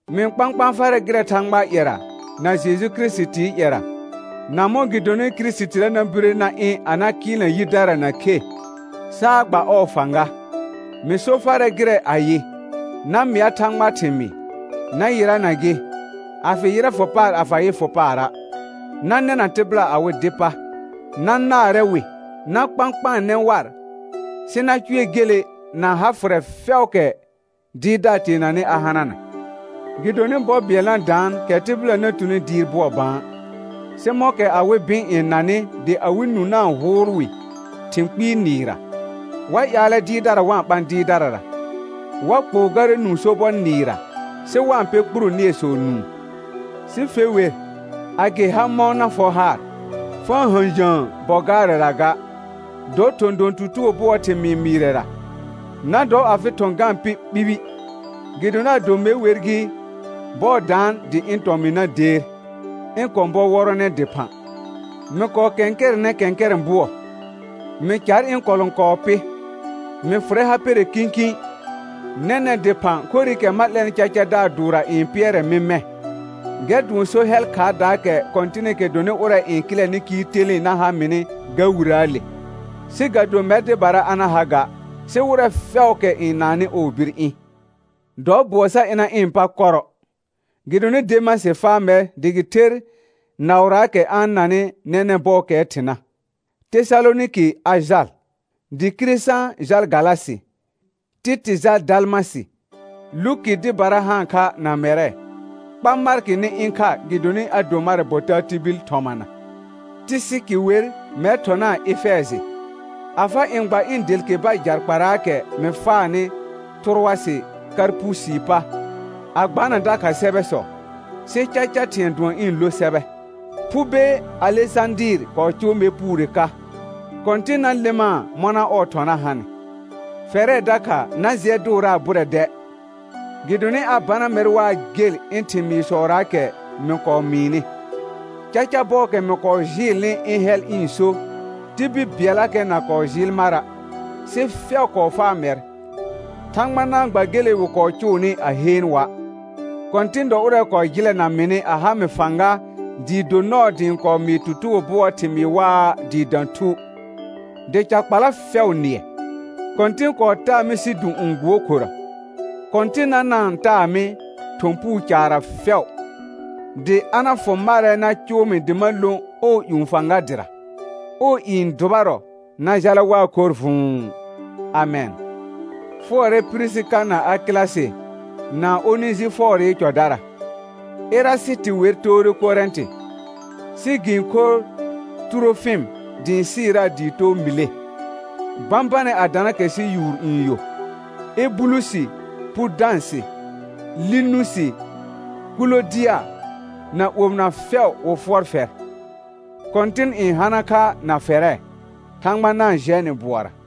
Mɩ-n kpãkpãa farɛ gɩrɛ Thãgbaa ƴɛra na Jeju Kirisitii ƴɛra, na mɔ̃ gɩ donɩ Kirisitira na bire na ɩ̃ a na kɩɩlna yidara na khe, saa gba ɔɔ fãga, mɩ so farɛ gɩrɛ ayɩ: Na mɩa Thãgbaa thɩmɩɩ, na yɩrana gɩ, a fɩ yɩrɛ fʋ paar a fa yɩ fʋ paara'; na nɛna tɩbɩla awɩ dɩ pa, na naarɛ wɩ, na kpãkpaanɛ war, sɩ na cʋɛ gele na ha fʋrɛ fɛʋʋkɛ dɩɩrdaar teenanɩ a hanana. Gɩdonɩ bɔ bɩɛl na daan kɛ tɩbɩla na tuni dɩɩr bʋɔ bã, sɩ mɔ̃kɛ awɩ bɩ̃ n nanɩ dɩ awɩ nũ na-n hʋʋl wɩ thɩ̃ kpɩɩ nɩɩrra, wa ƴaalɛ dɩɩrdara wa-n ɓã dɩɩrdarara. Wa kpʋʋ garɛ nũu sobɔ nɩɩrra, sɩ wa-n pɛ kpuro nɩɛsɔ nũu. Sɩ fe wer, a gɩ ha mɔ̃ na fɔ haar, fa-n hə̃jə̃ə bɔ gaarɛra ga, dɔ thɔ̃ don tutugo bʋɔɔ thɩmɩɩ mɩɩrɛra, na dɔ afɩ thɔ̃ ga-n pɩ ɓibi. Gɩdonɩ ado me wer gɩ, bɔɔ daan dɩ ɩ̃ tɔmɩ̃ na deer, ɩ̃ kɔ̃ bɔ wɔrɔnɛ dɩphã. Mɩ kɔɔ kɛ̃kɛrɛnɛ kɛ̃kɛrɛ̃ bʋɔ; mɩ car ɩ̃ kɔlɔ̃kɔɔ pɩ, mɩ fʋrɛ ha pɛrɛ kĩkĩ. Nɛnɛ̃ dɩphã khorɩkɛ ma 'lɛnɩ cacadaar dʋʋrra n pɩɛrɛ mɩ mɛ̃, gɛr dʋɔn so hɛl khaardaakɛ Kɔ̃tɩnɩkɛ dɔnɩ ʋrɛ n kɩlɛnɩ kɩɩl telẽe na ha mɩnɩ ga Wirəəle, sɩ ga do mɛr dɩbara a na ha ga, sɩ wɩrɛ fɛʋʋkɛ n naannɩ ɔɔ bir ɩ̃. Dɔ bʋɔ sa ɩna ɩ̃ pa kɔrɔ, gɩdonɩ Demasɩ faa mɛr dɩ gɩ ther naʋraakɛ a-n nanɩ nɛnɛ̃ bɔɔkɛɛ thɩna, Tesalonɩkɩ a jal, dɩ Kiresã jal Galasɩ, Tɩtɩ jal Dalmasɩ; Luki dɩbara haan kha na mɛrɛ; kpa Markɩ nɩ ɩ̃ kha gɩdonɩ a do marɛ bɔ taa tibil thɔmana. Tɩsɩkɩ wer mɛr thɔnaa Efɛjɩ. A fa ɩ̃ gba ɩ̃ delkeba jakparaakɛ mɩ faanɩ Tʋrʋasɩ Karpusii pa, a gbana dakha sɛbɛsɔ, sɩ caca thɩ̃ɛ dʋɔn ɩ̃ lo sɛbɛ. Phube Alesãdɩɩr kɔɔ cʋʋ mɛr puure ka; Kɔ̃tɩn na lɩmaa mɔna ɔɔ thɔna hanɩ. Fɛrɛ dakha na jɩɛ dʋʋraa bʋrɛ dɛ, gɩdonɩ a bana mɛr waa gel ɩ̃ thɩmɩɩsɔraakɛ mɩ kɔɔ mɩɩnɩ. Caca bɔɔkɛ mɩ kɔɔ jɩɩlnɩ ɩ̃ hɛl ɩ̃ so, tibil bɩɛllakɛ na kɔɔ jɩɩl mara', sɩ fɛʋ kɔɔ faa mɛr. Thãgba na-n gba gele wɩ kɔɔ cʋʋnɩ a heen wa'. Kɔ̃tɩn dɔ ʋrɛ kɔɔ jɩlɛna mɩnɩ a ha mɩ fãga dɩɩ do nɔɔ dɩ ɩ̃ kɔɔ mɩɩ tutugo bʋɔɔ thɩmɩɩ waa dɩɩ dã thu, dɩ ca kpala fɛʋ nɩɛ. Kɔ̃tɩn kɔɔ taa mɩ sidũ'ũ gbuokhorə. Kɔ̃tɩnna na-n taa mɩ thɔ̃ puu caarra fɛʋ, dɩ a na fʋ marɛ na cʋʋ mɩ dɩ ma lõ ɔɔ ƴũ fãga dɩra. Ɔɔ i n dʋbarɔ na jala waa khorr vʋ̃ʋ. Amɛn. Fʋɔrɛ Pirisika na Akɩlasɩ na Onejɩfɔɔrɩ cɔdara. Erasɩtɩ wer toore Korɛ̃tɩ, sɩ gɩ-n khor Tʋrofɩm dɩ ɩ̃ sɩɩraa dɩ too Mɩle. Bãbanɛ a dana kɛ sɩ yʋʋr n yo. Ebulusi, Pudãsɩ, Linusi, Kʋlodɩa na omɩna fɛʋ wɩ fʋɔr fɛr. Kɔ̃tɩn n hana kha na fɛrɛ. Thãgba na-n jɛ nɩ bʋɔra.